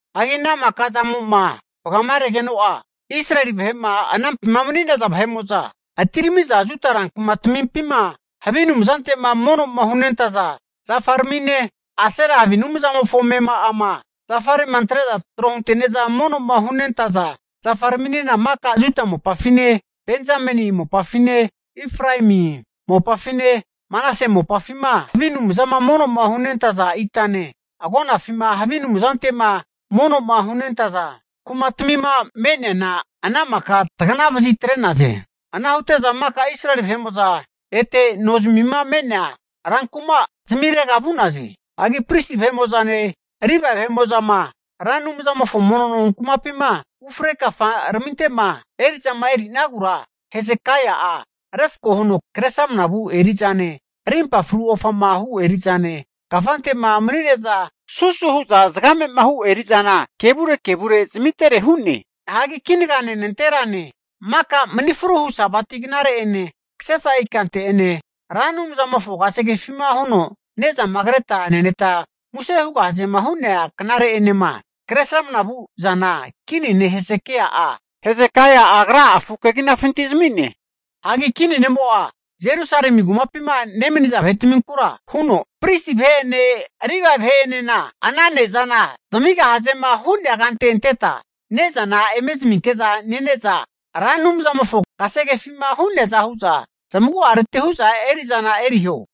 Hagi ana maka musenkase'zamo'ma vagamaregeno'a, Israeli vahe'ma anampima mani'naza vahe'mo'za atirami'za Juda rankumatamimpi vu'za havi anumzante'ma mono'ma hunentaza zafaramine, Asera havi anumzamofo amema'ama zafare'ma antre'za tro hunte'neza mono'ma hunentaza zafaraminena maka Juda mopafine, Benzameni mopafine, Efraemi mopafine, Manase mopafima, havi anumzama mono'ma hunentaza itane, agonafima havi anumzantema mono'ma hunentaza kumatmima me'neana ana maka taganavazi atre'naze. Ana hute'za maka Israeli vahe'mo'za ete nozmima me'nea rankuma zamirega vu'naze. Hagi pristi vahe'mo'zane Livae vahe'mo'zama Ra Anumzamofo mono nonkumapima ufre kafaraminte'ma eri'zama eri'nagura, Hesekai'a refko huno Kresramanama vu eri'zane, arimpa fru ofama hu eri'zane, kafante'ma manine'za susu hu'za zagame'ma hu eri'zana kevure kevure zamitere hu'ne. Hagi kinagane nanterane, maka mani fru hu Sabati knare'ene, kasefa ikante'ene, Ra Anumzamofo kasegefima huno ne'zama kreta neneta muse hugahazema hu'nea knare'enema Kresramanama vu zana kini ne' Hesekai'a agra'a afu keginafintira zami'ne. Hagi kini ne'mo'a Jerusalemi kumapima nemaniza vahetminkura huno, pristi vahe'ene Livae vahe'enena, ana ne'zana zamigahazema hu'nea kante anteta ne'zana eme zaminke'za nene'za, Ra Anumzamofo kasegefima hu'neaza hu'za zamagu'areti hu'za eri'zana eriho.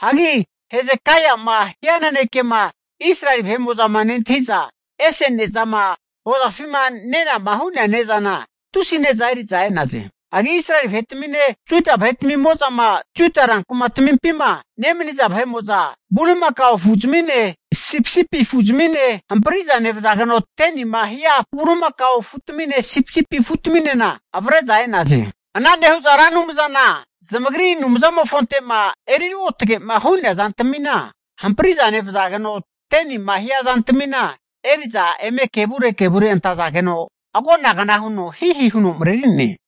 Hagi Hesekaia'ma hia nanekema Israeli vahe'mo'zama nentahi'za ese ne'zama hozafima nenama hu'nea ne'zana tusi ne'za eri'za e'naze. Hagi Israeli vahetamine Juda vahetamimo'zama Juda rankumatamimpima nemaniza vahe'mo'za bulimakao afuzmine, sipisipi afuzmine hampriza nevazageno, 10nima hia bulimakao afutamine sipisipi afutaminena avre'za e'naze. Ana nehu'za Ra Anumzana zamagri Anumzamofonte'ma eri ruotgema hu'nea zantamina hampriza nevazageno 10nima hia zantamina eri'za eme kevure kevure antazageno agonagna huno hihi huno mareri'ne.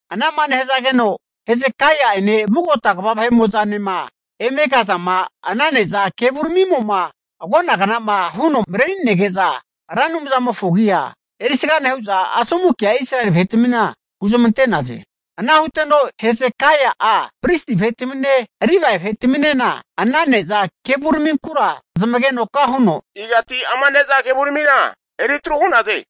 Ana'ma nehazageno Hesekai'ene vugota kva vahe'mo'zanema eme kazama ana neza kevuramimo'ma agonagna'ma huno mareri'nege'za, Ra Anumzamofona agia erisga nehu'za, asomu kea Israeli vahetmina huzmante'naze. Ana huteno Hesekai'a pristi vahetamine Livae vahetaminena ana ne'za kevuraminkura zamagenoka huno, Igati ama ne'za kevuramina eri atru hu'naze?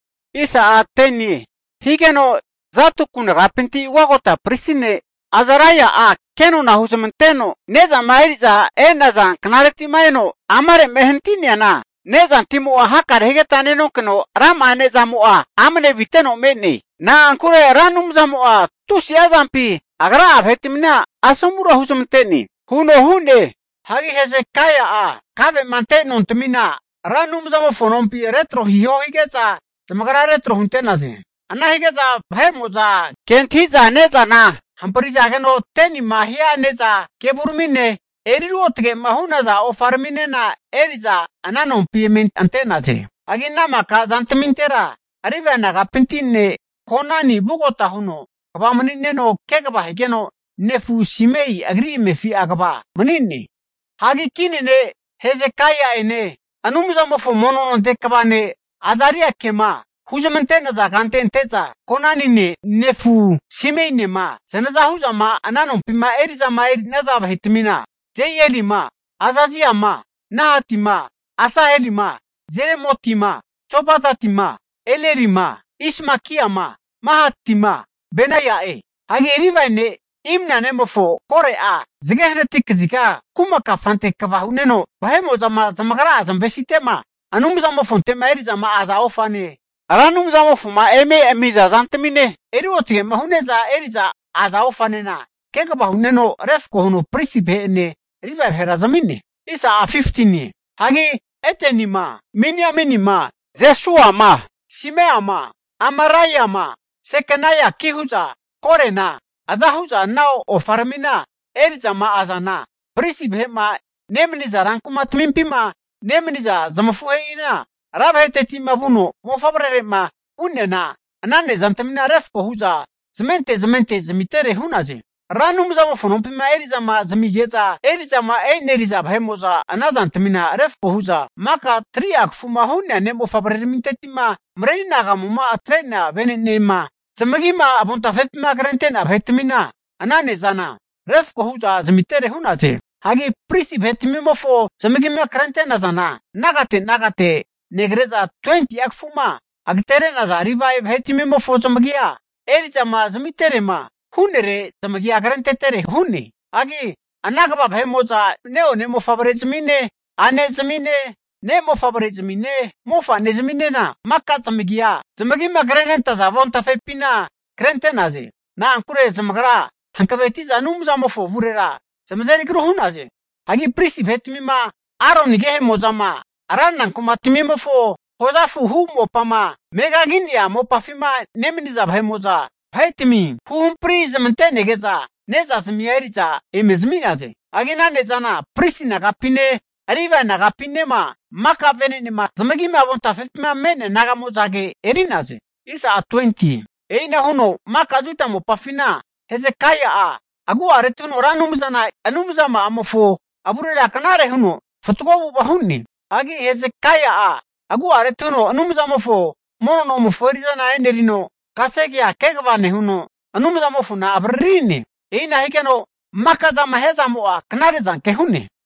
Higeno Zadoku nagapinti ugagota pristi ne' Azaraia'a kenona huzmanteno ne'zama eri'za e'naza knareti'ma eno amare'ma ehanati'neana, nezantimo'a hakare higeta nenonkeno rama'a ne'zamo'a amne aviteno me'ne. Na'ankure Ra Anumzamo'a tusi'a zampi Agra'a vahetmina asomura huzmante huno hu'ne. Hagi Hesekai'a kave'ma ante nontamina, Ra Anumzamofo nompi retro hiho hige'za, zamagra retro hunte'naze. Ana hige'za vahe'mo'za kentahiza ne'zana hamprizageno 10nima hia ne'za kevuramine, eri ruotgema hu'naza ofaraminena eri'za ana nompi eme ante'naze. Hagi ana maka zantmintera Livae nagapinti ne' Konani vugota huno kva mani'neno kegava higeno, nefu Semei agri amefi'a kva mani'ne. Hagi kini ne' Hesekai'ene Anumzamofo mono nonte kva ne' Azariake'ma huzmante'naza kante ante'za Konanine nefu, Simeinema zanaza hu'zama ana nompima eri'zama eri'naza vahetmina, Jehieli'ma, Azazia'ma, Nahati'ma, Asaheli'ma, Jerimoti'ma, Jozabati'ma, Elieli'ma, Ismakia'ma, Mahati'ma, Benaia'e. Hagi Livae ne' Imna nemofo Kore'a, zage hanati kaziga kuma kafante kva hu'neno vahe'mo'zama zamagra'a zamavesite'ma Anumzamofonte'ma eri'za aza ofane, Ra Anumzamofoma eme ami'za zantamine, eri ruotge hu'neza eri'za aza ofanena kegava hu'neno refko huno pristi vahe'ene Livae vahera zami'ne. Hagi Edeni'ma, Miniamini'ma, Jesua'ma, Semaia'ma, Amaraia'ma, Sekeniaki hu'za Korena aza hu'za ana ofaramima eri'zama azana pristi vahe'ma nemaniza ran kumatamimpima nemaniza zamafuhe'ina, ra vahetetima vuno mofavrere'ma vu'neana, ana ne'zantamina refko hu'za zamente zmente zamitere hu'naze. Ra Anumzamofo nompima eri'zama zamige'za eri'zama eneri'za vahera ana zantamina refko hu'za maka 3'a kafuma hu'nea ne' mofavreramintetima mareri anagamuma atre'nea venenema zamagima avontafepima krente'nea vahetmina ana ne'zana refko hu'za zamitere hu'naze. Hagi pristi vahetmimofo zamagima kre'nazana, nagate nagate negre'za 20'a kafuma agatere'naza Livae vahetmimofo zamagia eri'zama zamiterema hu'nere zamagi'a krentetere hu'ne. Hagi ana kva vahe'mo'za ne'one mofavrezmine, a'nezmine, ne' mofavrezmine, mofa'nezminena zamagima krenentaza avontafepina maka zamagia krente'naze. Na'ankure zamagra'a hankavetiza Anumzamofo avurera zamazeri agru hu'naze. Hagi pristi vahetmima Aroni agehemo'zama ranra kumatamimofo hozafu hu mopama megagi'nea mopafima nemaniza vahe'mo'za, mago'a vahetami huhampri zamante'nege'za ne'zazmia eri'za ome zami'naze. Hagi ana ne'zana pristi nagapine, Livae nagapinema maka venenema zamagima avontafepima me'nea naga'mo'zage eri'naze. E'inahu huno maka Juda mopafina Hezekaia'a agu'areti huno Ra Anumzana Anumzama'amofo avurera knare huno fatgo avu'ava hu'ne. Hagi Hesekai'a agu'areti huno Anumzamofo mono nomofo eri'zana enerino, kasegea kegava nehuno, Anumzamofona avaririne. E'ina higeno maka zama hia zamo'a knare'zanke hu'ne.